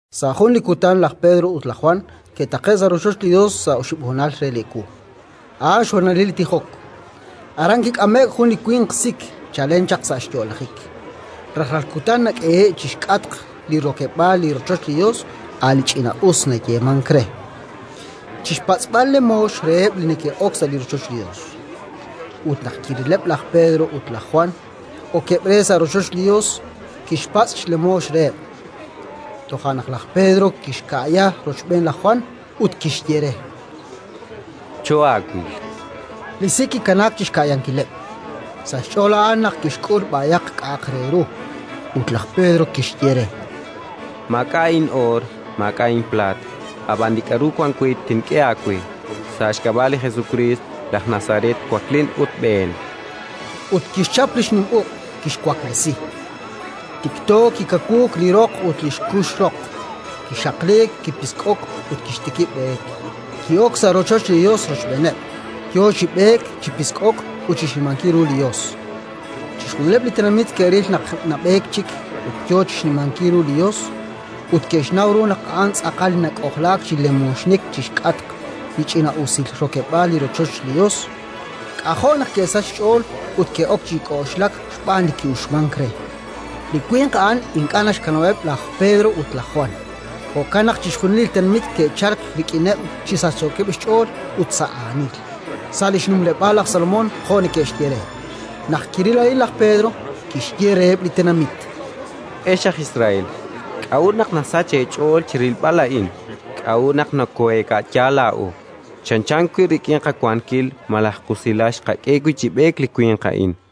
Sa' jun li kutan laj Pedro ut laj Jwan ke'taqe'k sa' rochoch li Yos sa' oxib' honal re li ewu: a'an xhonalil li tijok. Aran kik'ame'k jun li winq sik chalen chaq sa' xyo'lajik. Rajlal kutan nak'ehe'k chi xk'atq li rokeb'aal li rochoch li Yos, a' li Ch'ina'us nayeemank re, chi xpatz'b'al xlemoox reheb' li neke'ok sa' rochoch li Yos. Ut naq kirileb' laj Pedro ut laj Jwan okeb' re sa' rochoch li Yos, kixpatz' xlemoox reheb'. Toja' naq laj Pedro kixka'ya rochb'een laj Jwan ut kixye re: —Choohaawil. Li sik kikanaak chi xka'yankileb': sa' xch'ool a'an naq tixk'ul b'ayaq k'a'aq re ru. Ut laj Pedro kixye re: —Maak'a' in'oor, maak'a' inplaat; ab'an li k'aru wank we tink'e aawe: sa' xk'ab'a' li Jesukriist, laj Nazaret, waklin ut b'een. Ut kixchap li xnim uq', kixwaklesi. Tikto kikawuuk li roq ut li xkux roq, kixaqliik, kipisk'o'k ut kixtikib' b'eek. Ki'ok sa' rochoch li Yos rochb'eeneb', yo chi b'eek, chi pisk'ok ut chi xnimankil ru li Yos. Chixjunileb' li tenamit ke'ril naq nab'eek chik ut yo chi xnimankil ru li Yos, ut ke'xnaw ru naq a'an tz'aqal li nak'ojlaak chi lemooxnik chi xk'atq li Ch'ina'usil Rokeb'aal li rochoch li Yos. K'ajo' naq ke'sachk xch'ool ut ke'ok chi k'oxlak xb'aan li ki'uxmank re. Li winq a'an ink'a' naxkanab'eb' laj Pedro ut laj Jwan; jo'kan naq chixjunil li tenamit ke'chalk rik'ineb' chi sachsookeb' xch'ool ut sa' aanil, sa' li xnumleb'aal laj Salomón, jo' neke'xye re. Naq kiril a'in laj Pedro, kixye reheb' li tenamit: “Ex aj Israel, k'a'ut naq nasachk eech'ool chi rilb'al a'in? K'a'ut naq nokooheeka'ya laa'o, chanchan wi' rik'in qawankil malaj qusilal xqak'e wi' chi b'eek li winq a'in?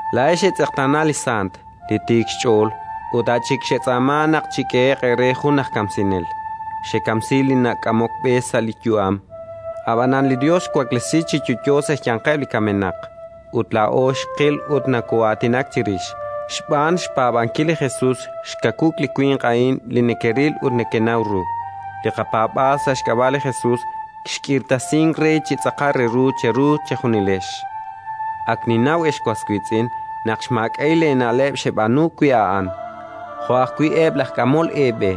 Laa'ex xetz'eqtaana li Sant, li Tiik xch'ool, ut a' chik xetz'aama naq chik'ehe'q eere jun aj kamsinel. Xekamsi li nak'amok b'e sa' li yu'am. Ab'anan li Yos xwaklesi chi yo'yo sa' xyanqeb' li kamenaq, ut laa'o xqil ut nokoo'aatinak chirix. Xb'aan xpaab'ankil li Jesus xkawuuk li winq a'in li nekeril ut nekenaw ru: li qapaab'aal sa' xk'ab'a' li Jesus xk'irtasink re chi tz'aqal re ru cheru chejunilex. “Ak ninnaw, ex was wiitz'in, naq xmaak'a'il eena'leb' xeb'aanu wi' a'an, jo' ajwi' eb' laj k'amol eeb'e.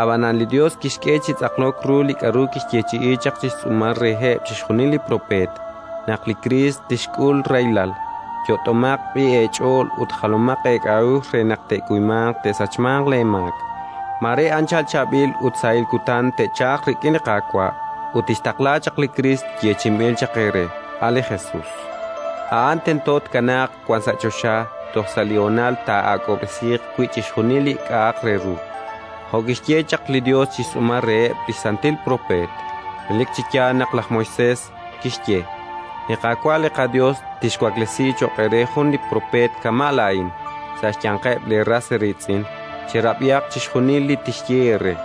Ab'anan li Yos xk'e chi tz'aqlok ru li k'aru kixyeechi'i chaq chi xtz'uumal reheb' chixjunil li propeet, naq li xKriist tixk'ul rahilal. Yot'omaq b'i' eech'ool ut jalomaq eek'a'uxl re naq te'kuymanq te'sachmanq leemaak. Mare anchal chaab'il ut sahil kutan te'chalq rik'in li Qaawa', ut tixtaqla chaq li Kriist yeechi'inb'il chaq eere, a' li Jesus. A'an tento tkanaaq wan sa' choxa toj sa' li honal taa'ak'ob'resiiq wi' chixjunil li k'a'aq re ru, jo' kixye chaq li Yos chi xtz'uumal reheb' li xsantil propeet. Relik chi yaal naq laj Moisés kixye: «Li Qaawa' li qaYos tixwaklesi cho'q eere jun li propeet kama' laa'in, sa' xyanqeb' leeras eeriitz'in; cherab'ihaq chixjunil li tixye eere.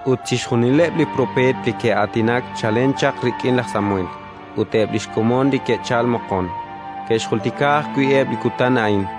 “Ut chixjunileb' li propeet li ke'aatinak chalen chaq rik'in laj Samuel ut eb' li xkomon li ke'chalk moqon, ke'xjultika ajwi' eb' li kutan a'in.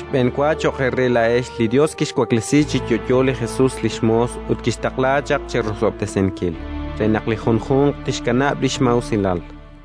Xb'enwa cho'q eere laa'ex li Yos kixwaklesi chi yo'yo li Jesus li xmoos ut kixtaqla chaq cherosob'tesinkil, re naq li junjunq tixkanab' li xmaa'usilal”.